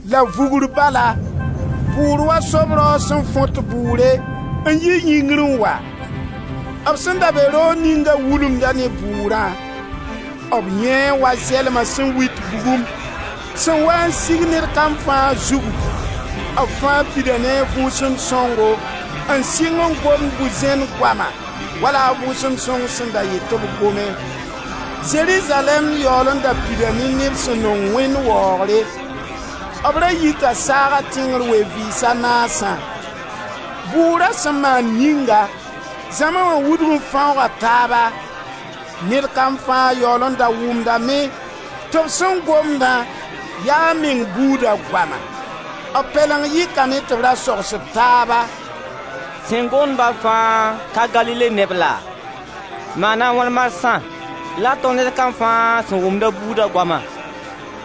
La vugr bala bʋʋr wa sob raoog sẽn fõt bʋʋre n yi yĩngri n wa. B sẽn da be roog ninga wulumda ne bʋʋrã. B yãee wa zɛlma sẽn wit bugum, sẽn waa n sig ned kam fãa zugu. B fãa pida ne a Vʋʋsem Sõngo n sɩng n gomd bu-zẽn goama wala a Vʋʋsem Sõng sẽn da yet tɩ gome. Zerizalɛɛm yaool n da pida ne neb sẽn nong Wẽnd waoogre. B ra yita saaga tẽngr ween-vɩɩs a naasã. Bʋʋra sẽn maan yĩnga, zãma wã wudg n fãooga taaba. Ned kam fãa yaool n da wʋmdame tɩ b sẽn gomdã ya a meng buuda goama. B Pɛleng yɩkame tɩ b ra sogsd taaba: «Sẽn gomd-ba fãa ka Galile neb laa? Maana a wãn marsã la tõnd ned kam fãa sẽn wʋmd a buuda goama?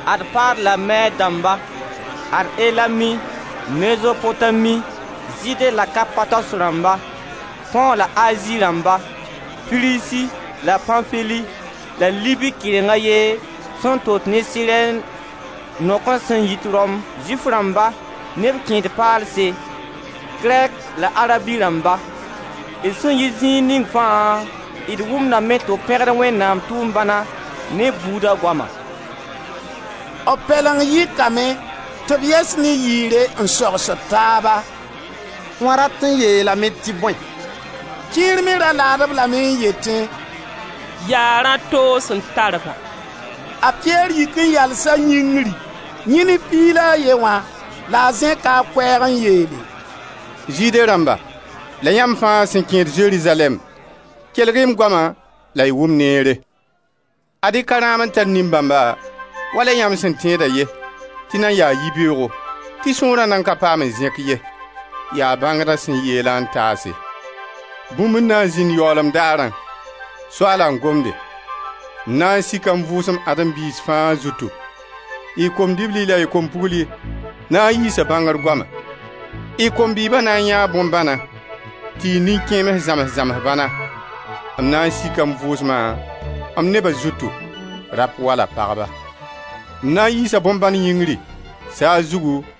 Ad Part la Mɛd dãmba, ad Elamit, Mezopotami, Zɩɩde la Kapados rãmba, Põ la Azi rãmba, Frizi la Pãnfili la Libi kɩreng a ye sẽn tot ne Sirɛn, noakens sẽn yit Rom, Zʋɩf rãmba ne b kẽed-paalse, Krɛt la Arabi rãmba. D sẽn yit zĩig ning fãa, d wʋmdame tɩ b pẽgd Wẽnnaam tʋʋm-bãna ne d buuda goama!» B pɛleng yɩkame, tɩ b yɛs ne yɩɩre n sogsd taaba: «Wã rat n yeelame tɩ bõe?» Kẽer me ra laad-b lame n yetẽ: «Yaa rã toos n tar ba.» A Piyɛr yik n yalsa yĩngri, yẽ ne Piig la a ye wã, la a zẽka a koɛɛg n yeele: «Zɩɩde rãmba la yãmb fãa sẽn kẽed Zerizalɛɛm, kelg-y m goama la y wʋm neere. Ad-y ka rãam n tar nin-bãmba, wala yãmb sẽn tẽeda ye tɩ nan yaa yibeoogo, tɩ sõora nan ka paam n zẽk ye. Yaa bãngda sẽn yeelã n taase: ‹Bũmb n na n zĩnd yaoolem daarã — Soaala n gomde — m na n sika m Vʋʋsem Adem biis fãa zutu. Y kom-dibli la y kom-pugli na n yiisa bãngr goama. Y kom-bɩɩba na n yãee bõn-bãna tɩ y nin-kẽems zãms-zams bãna. M na sika m Vʋʋsma m neba zutu, rap wala pagba. M na n yiisa bõn-bãn yĩngri, saag zugu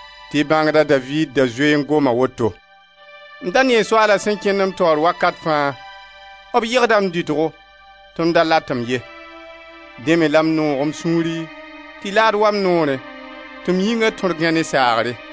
tɩ bãngda Daviid da zoe n goma woto: ‹M da nee Soaala sẽn n kẽnd m taoor wakat fãa; b yegda m dɩtgo tɩ m da latem ye; dẽ me la m noog m sũuri tɩ laad wa n noorẽ tɩ m yĩnga tõr gãe ne saagre,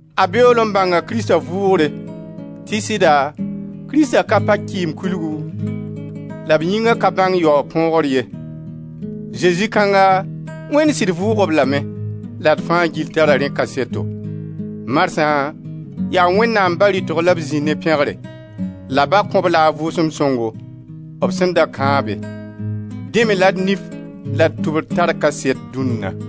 a beool n bãnga Krista vʋʋgre, tɩ sɩda Krista ka pa Kɩɩmkulgu, la b yĩnga ka bãng yaoog põogr ye. Zezi kãnga, Wẽnd sɩd vʋʋg-b lame, la d fãa gill tara rẽ kaseto. Marsã yaa Wẽnnaam Ba rɩtg la b zĩ ne pẽgre. La Ba kõ-b la a Vʋʋsem Sõngo, b sẽn da kãabe. Dẽ me la y nif la y tʋbr tar kaset dũnna.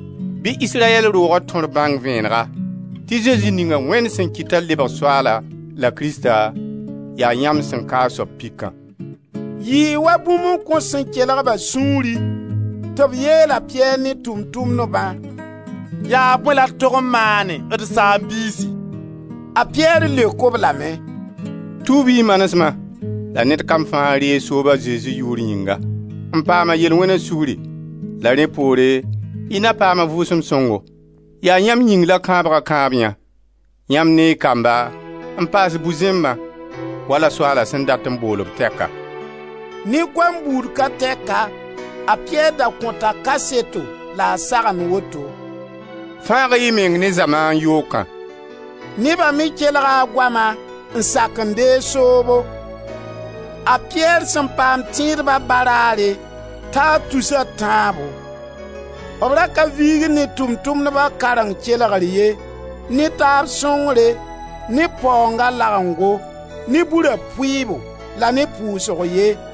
Bɩ Israyɛl rooga tõr bãng vẽenega, tɩ Zezi ninga Wẽnd sẽn kɩt t'a lebg Soaala la Krista, yaa yãmb sẽn ka a soab pikã.» Yɩɩ wa bũmb n kõs sẽn kelg-ba sũuri, tɩ b yeel a Piyɛr ne Tʋʋm-tʋmdbã: «Yaa bõe la d tog n maane, d saam-biisi?» A Piyɛr leok-b lame: «Tuub-y y manesma la ned kam fãa reeg soob a Zezi yʋʋr yĩnga, n paam a yel-wẽna sugri, la rẽ poore y na paam a Vʋʋsem Sõngo. Yaa yãmb yĩng la kãabga kãabyã, yãmb ne y kamba n paas bu-zẽmbã, wala Soaala sẽn dat n bool-b tɛka.» Ne goam buud ka tɛka, a Piyɛr da kõta kaseto la a sagend woto: «Fãag-y y meng ne zamaan yookã.» Neba me kelga a goama n sak n deeg soobo. A Piyɛr sẽn paam tẽedba baraare, taa tus a tãabo. B ra ka viigd ne Tʋʋm-tʋmdba kareng kelgr ye, ne taab sõngre, ne b paoonga lagengo, ne Bura pʋɩɩbo, la ne pʋʋsg ye.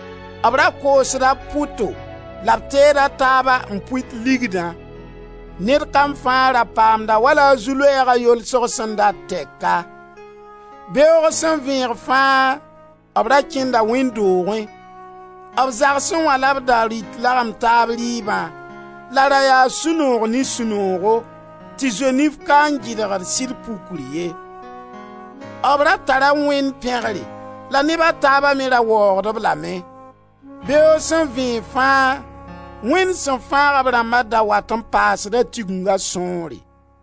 B ra koosda b pʋto la b teed a taaba n pʋɩt ligdã. Ned kam fãa ra paamda wala a zu-loɛɛga yolsg sẽn dat tɛka. Beoog sẽn vẽeg fãa b ra kẽnda wẽnd doogẽ. B zagsẽ wã la b da rɩt lagem taab rɩɩbã la ra yaa sũ-noog ne sũ-noogo tɩ zoenif ka n gɩdgd sɩd pukri ye. B ra tara Wẽnd pẽgre la neba taaba me ra waoogd-b lame. Beoog sẽn vẽeg fãa, Wẽnd sẽn fãag b rãmba da wat n paasda Tiginga sõore.